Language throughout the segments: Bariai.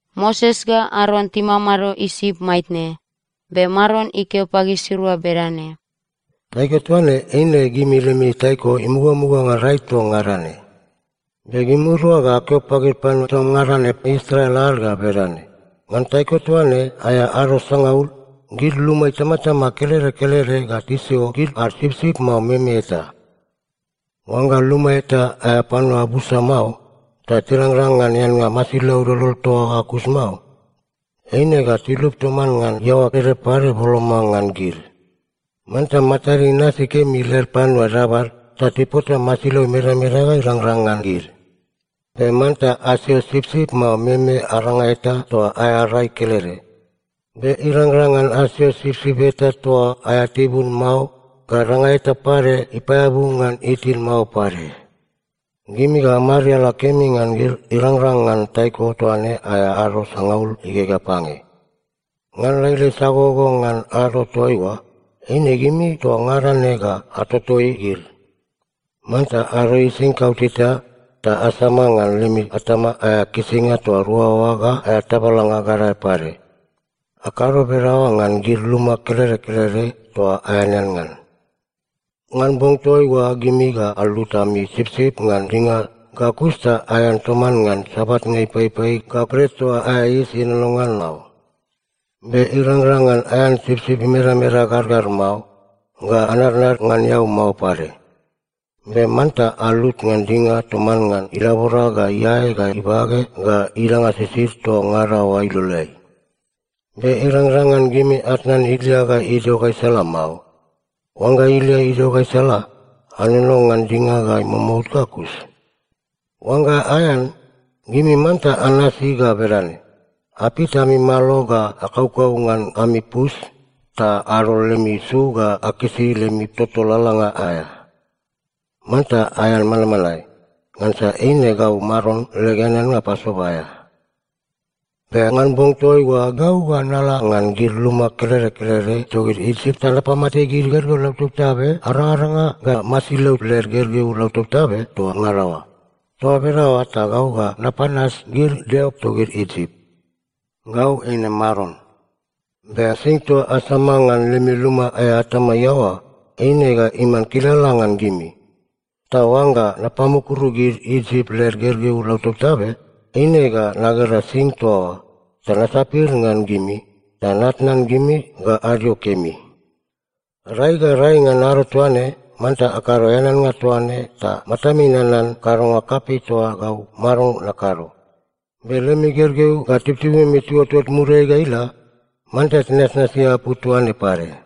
Moses ga Aron timamado Isip maitne, be Maron ikeo pagisirua bedane, “Taiko toaine eine gimi lemi taiko imugamuga ngan rai toa ngada ne. Be gimirua ga akeo pagid panua toa ngada ne Israel ad ga bedane: Ngan taiko toaine aea ado sangaul, gid luma itamatama kelede kelede ga tisio gid ad sipsip mao meme eta. Oangga luma eta aea panua busa mao ta tirangrang ngan eannga masilau dodol toa oa ga kus mao, eine ga tilup toman ngan iaoa ede pade boloma ngan gid. Manta matad inasi kemi led panua dabad ta tipota masilau imedameda ga irangrang ngan gid. Be manta asio sipsip mao meme aranga eta toa aea rai kelede. Be irangrang ngan asio sipsip eta toa aea tibun mao ga danga eta pade ipaeabu ngan itin mao pade. “Gimi ga amariala kemi ngan gid irangrang ngan taiko toaine aea ado sangaul igegea pange. Ngan lailai sagogogo ngan ado toaiua, eine gimi toa ngada ne ga atotoi gid. Manta adoi singid kauteta ta asama ngan lemi atama aea kisinga toa rua oa ga aea tabalanga gadae pade. Akado bedaoa ngan gid luma kelede kelede toa aeanean ngan. Ngan bong toaiua gimi ga alut ami sipsip ngan dinga ga kus ta aean toman ngan sabatnga ipaipai ga bret toa aea yis ienono ngan mao. Be irangrang ngan aean sipsip imedameda gargar mao, ga anadnad ngan eau mao pade. Be manta alut ngan dinga toman ngan ilabora ga iae ga ibage ga idanga sisid toa ngada oa iloleai. Be irangrang ngan gimi atnan ilia ga idio gaisala mao. Oangga ilia idio gaisala, anono ngan dinga ga imomout ga kus. Oangga aean, gimi manta anasi ga bedane: Apit ami malo ga akaukau ngan ami pus, ta adol lemi su ga akisi lemi toto lalalanga aea. Manta aean manmanae. Ngansa eine gau Maron leg eaneannga Pasova aea. “Be ngan bong toaiua gau ga nala ngan gid luma kelede kelede togid Isip ta napamate gid gergeu lautabtabe arangaranga ga masilau led gergeu lautabtabe toa ngada oa. Toa bedaoa ta gau ga napanas gid deo togid Isip. Gau eine Maron. Be sing toa asama ngan lemi luma aea atama iaoa, eine ga iman kilala ngan gimi. Ta oangga napamukuru gid Isip led gergeu lautabtabe, eine ga nagera sing toa oa, ta nasapir ngan gimi, ta natnan gimi ga adio kemi. “Rai ga rai ngan ado toaine, manta akado eaneannga toa ne ta matami nanan kadonga kapei toa gau Maron nakado. Be lemi gergeu ga tibutibumi tiuotot muriai ga ila, manta tinasnasi apu toa ne pade.”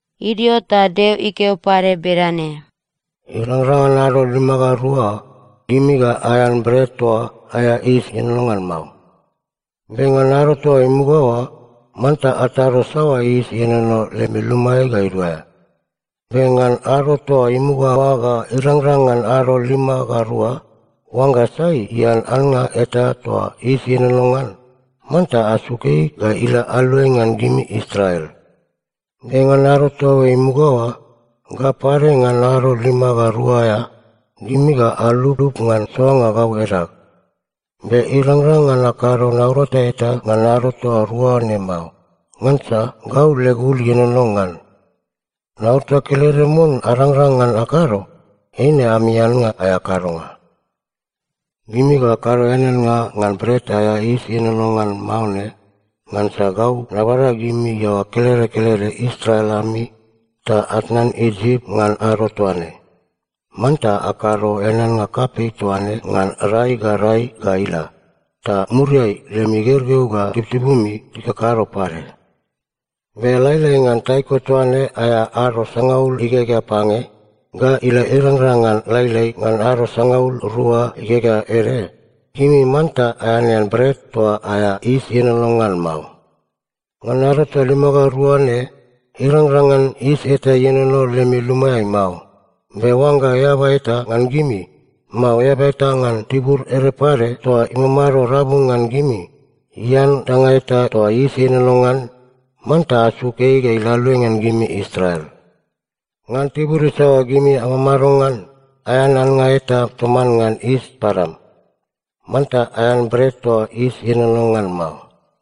Idio ta Deo ikeo pade bedane, “Irangrang ngan ado lima ga rua, gimi ga aean bret toa aea yis ienono ngan mao. Be ngan ado toa imuga oa, manta atado saoa yis ienono lemi lumaeai ga iduaea. Be ngan ado toa imuga oa ga irangrang ngan ado lima ga rua, oangga sai ian annga eta toa yis ienono ngan, manta asuk ei ga ila aluai ngan gimi Israel. Be ngan ado toa imuga oa, ga pade ngan ado lima ga rua aea, gimi ga aluplup ngan soanga gau edag. Be irangrang ngan akado naurata eta ngan ado toa rua ne mao, ngansa gau leg ul ienono ngan. Naurata kelede mon arangrang ngan akado, eine ami annga aea kadonga. “Gimi ga akado eaneannga ngan Bret aea Yis Ienono ngan Mao ne, ngansa gau nabada gimi iaoa kelede kelede Israel ami ta atnan Isip ngan ado toaine. Manta akado eaneannga kapei toa ne ngan rai ga rai ga ila, ta muriai lemi gergeu ga tibutibumi tikakado pade. Be lailai ngan taiko toaine aea ado sangaul igegea pange, ga ila irangrang ngan lailai ngan ado sangaul rua igegea ede, gimi manta aeanean bret toa aea yis ienono ngan mao. Ngan ado toa lima ga rua ne, irangrang ngan yis eta ienono lemi lumaeai mao. Be oangga eaba eta ngan gimi, mao eaba eta ngan tibur ede pade toa imamado rabu ngan gimi ian danga eta toa yis ienono ngan, manta asuk ei ga ila aluai ngan gimi Israel. Ngan tibur isaoa gimi amamado ngan, aean annga eta toman ngan yis padam. Manta aean bret toa yis ienono ngan mao.”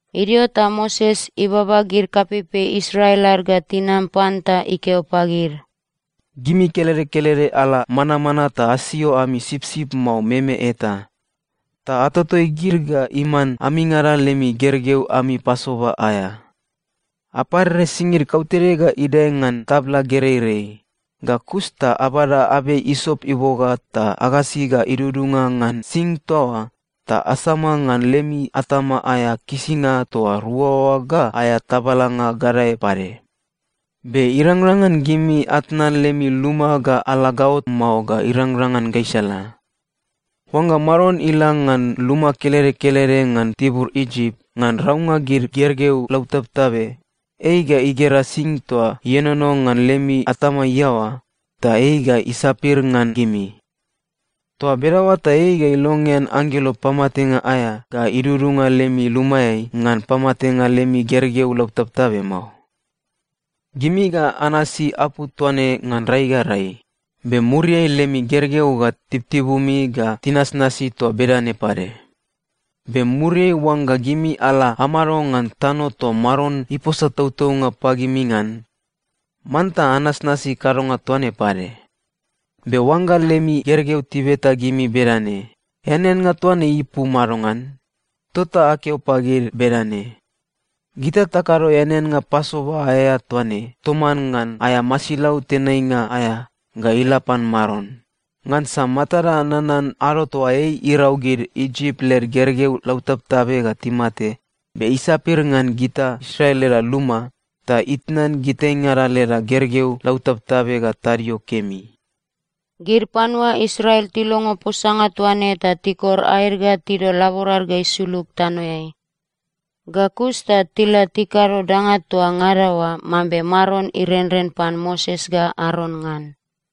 Idio ta Moses ibaba gid kapeipei Israel ad ga tinam pan ta ikeo pagid, “Gimi kelede kelede ala manamana ta asio ami sipsip mao meme eta, ta atotoi gid ga iman amingada lemi gergeu ami Pasova aea. Aparere singid kautede ga idae ngan tabla gereirei, ga kus ta abada abei isop iboga ta agasi ga idudunga ngan sing toa oa, ta asama ngan lemi atama aea kisinga toa rua oa ga aea tabalanga gadae pade. Be irangrang ngan gimi atnan lemi luma ga ala gaot mao ga irangrang ngan gaisala. Oangga Maron ila ngan luma kelede kelede ngan tibur Isip ngan raunga gid gergeu lautabtabe, ei ga igera sing toa ienono ngan lemi atama iaoa, ta ei ga isapir ngan gimi. Toa bedaoa ta ei ga ilongean anggelo pamatenga aea ga idudunga lemi lumaeai ngan pamatenga lemi gergeu lautabtabe mao. “Gimi ga anasi apu toa ne ngan rai ga rai, be muriai lemi gergeu ga tibutibumi ga tinasnasi toa bedane pade. Be muriai oangga gimi ala amado ngan tano toa Maron iposa tautaunga pagimi ngan, manta anasnasi kadonga toa ne pade. Be oangga lemi gergeu tibeta gimi bedane, ‘Eaneannga toa ne ipu madongan?’ tota akeo pagid bedane, ‘Gita takado eaneannga Pasova aea toa ne toman ngan aea masilau tenainga aea ga ila pan Maron, ngansa matada nanan ado toa ei irau gid Isip led gergeu lautabtabe ga timate, be isapir ngan gita Israel leda luma ta itnan gitaingada leda gergeu lautabtabe ga tadio kemi.’” Gid panua Israel tilongo posanga toa ne ta tikor aed ga tidol laborad ga isulug tanoeai. Ga kus ta tila tikado danga toa ngada oa mambe Maron irenren pan Moses ga Aron ngan.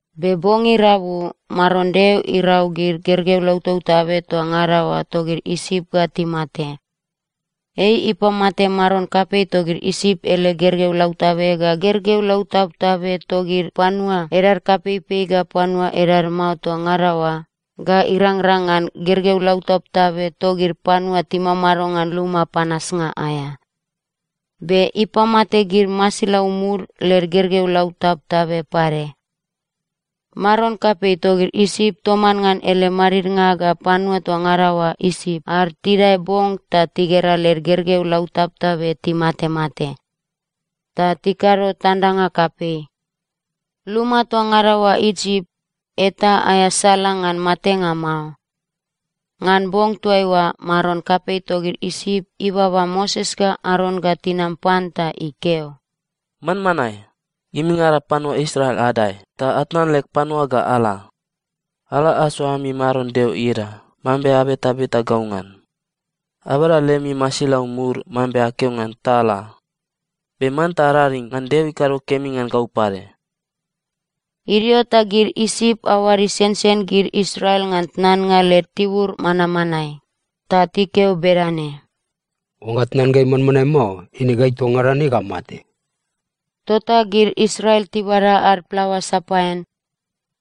Be bong irabu Maron Deo irau gid gergeu lautabtabe toa ngada oa togid Isip ga timate. Ei ipamate maron kapei togid Isip ele gergeu lautabe ga gergeu lautabtabe togid panua edad kapeipei ga panua edad mao toa ngada oa ga irangrang ngan gergeu lautabtabe togid panua timamado ngan luma panasnga aea. Be ipamate gid masilau mud led gergeu lautabtabe pade. Maron kapei togid Isip toman ngan ele madidnga ga panua toa ngada oa Isip ad tidae bong ta tigera led gergeu lautabtabe timatemate, ta tikado tandanga kapei. Luma toa ngada oa Isip, eta aea sala ngan matenga mao. Ngan bong toaiua maron kapei togid Isip ibaba Moses ga Aron ga tinam pan ta ikeo, “Manmanae! Gimingada panua Israel adae ta atnan leg panua ga ala. Ala asoa ami Maron Deo ieda mambe abetabeta gau ngan. Abada lemi masilau mud mambe akeo ngan ta ala. Be manta araring ngan Deo ikado kemi ngan gau pade.” Idio ta gid Isip aoad isensen gid Israel ngan tnannga led tibur manmanae. Ta tikeo bedane, “Oangga atnan gai manmanae mao, eine gai toa ngada ne ga amate!” Tota gid Israel tibada ad plaoa sapaean.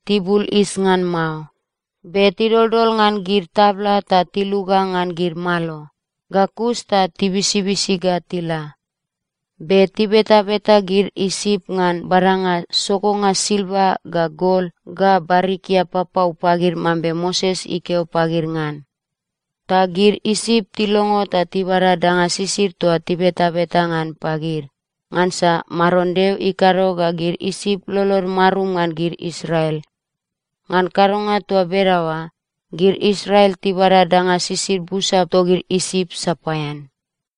Tibul yis ngan mao, be tidoldol ngan gid tabla ta tiluga ngan gid malo, ga kus ta tibisibisi ga tila. Be tibetabeta gid Isip ngan badanga sogonga silva ga gol ga barikia papau pagid mambe Moses ikeo pagid ngan. Ta gid Isip tilongo ta tibada danga sisid toa tibetabeta ngan pagid, ngansa Maron Deo ikado ga gid Isip lolod marum ngan gid Israel. Ngan kadonga toa bedaoa, gid Israel tibada danga sisid busa togid Isip sapaean.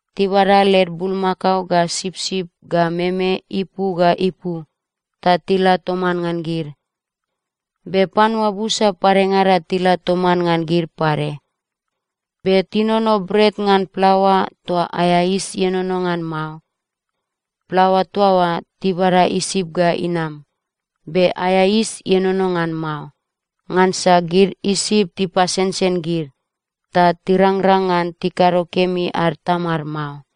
Tibada led bulmakao ga sipsip ga meme ipu ga ipu ta tila toman ngan gid. Be panua busa padengada tila toman ngan gid pade. Be tinono bret ngan plaoa toa aea yis ienono ngan mao. Plaoa toa oa tibada Isip ga inam, be aea yis ienono ngan mao, ngansa gid Isip tipasensen gid, ta tirangrang ngan tikado kemi ad tamad mao.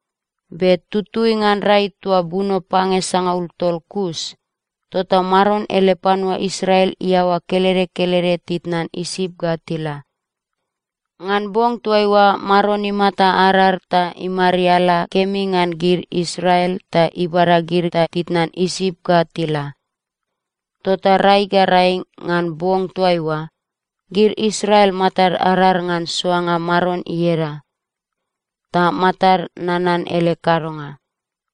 Be tutui ngan rai toa buno pange sangaul tol kus, tota Maron ele panua Israel iaoa kelede kelede titnan Isip ga tila. Ngan bong toaiua Maron imata arar ta imariala kemi ngan gid Israel ta ibada gid ta titnan Isip ga tila. Tota rai ga rai ngan bong toaiua, gid Israel matad arar ngan soanga Maron ieda, ta matad nanan ele kadonga.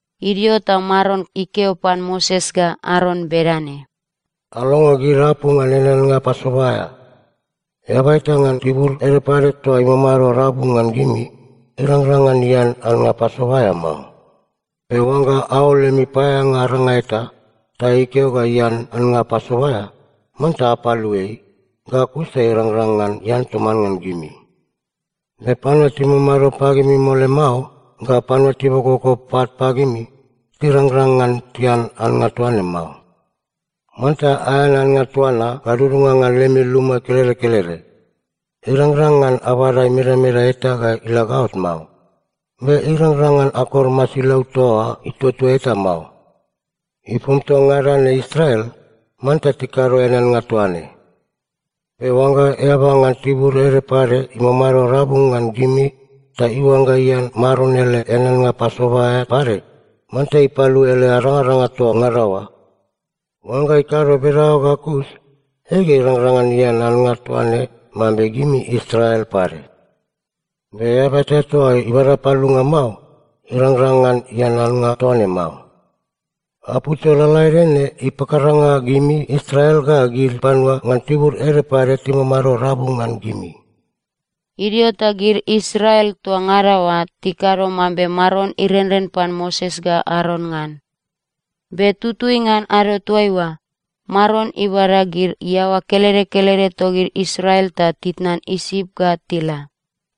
Idio ta Maron ikeo pan Moses ga Aron bedane, “Alongo gid apu ngan eaneannga Pasova aea: “Eaba eta ngan tibur ede pade toa imamado rabu ngan gimi, irangrang ngan ian annga Pasova aea mao. Be oangga aol lemi paeaeanga aranga eta, ta ikeo ga ian annga Pasova aea, manta apalu ei, ga kus ta irangrang ngan ian toman ngan gimi. Be panua timamado pagimi mole mao, ga panua tibokoboko pat pagimi, tirangrang ngan tian annga toa ne mao. “Manta aean annga toa na gadudunga ngan lemi luma kelede kelede. Irangrang ngan abada imedameda eta ga ila gaot mao. Be irangrang ngan akor masilau toa oa ituatua eta mao. Ipom toa ngada ne Israel, manta tikado eaneannga toa ne. “Be oangga eaba ngan tibur ede pade imamado rabu ngan gimi ta iuangga ian Maron ele eaneannga Pasova aea pade, manta ipalu ele arangaranga toa ngada oa. Oangga ikado bedaoa ga kus, ei ga irangrang ngan ian annga toa ne mambe gimi Israel pade. Be eaba eta toa ibada palunga mao, irangrang ngan ian annga toa ne mao. Apu toa lalaede ne ipakaranga gimi Israel ga gid panua ngan tibur ede pade timamado rabu ngan gimi.” Idio ta gid Israel toa ngada oa tikado mambe Maron irenren pan Moses ga Aron ngan. Be tutui ngan ado toaiua, Maron ibada gid iaoa kelede kelede togid Israel ta titnan Isip ga tila.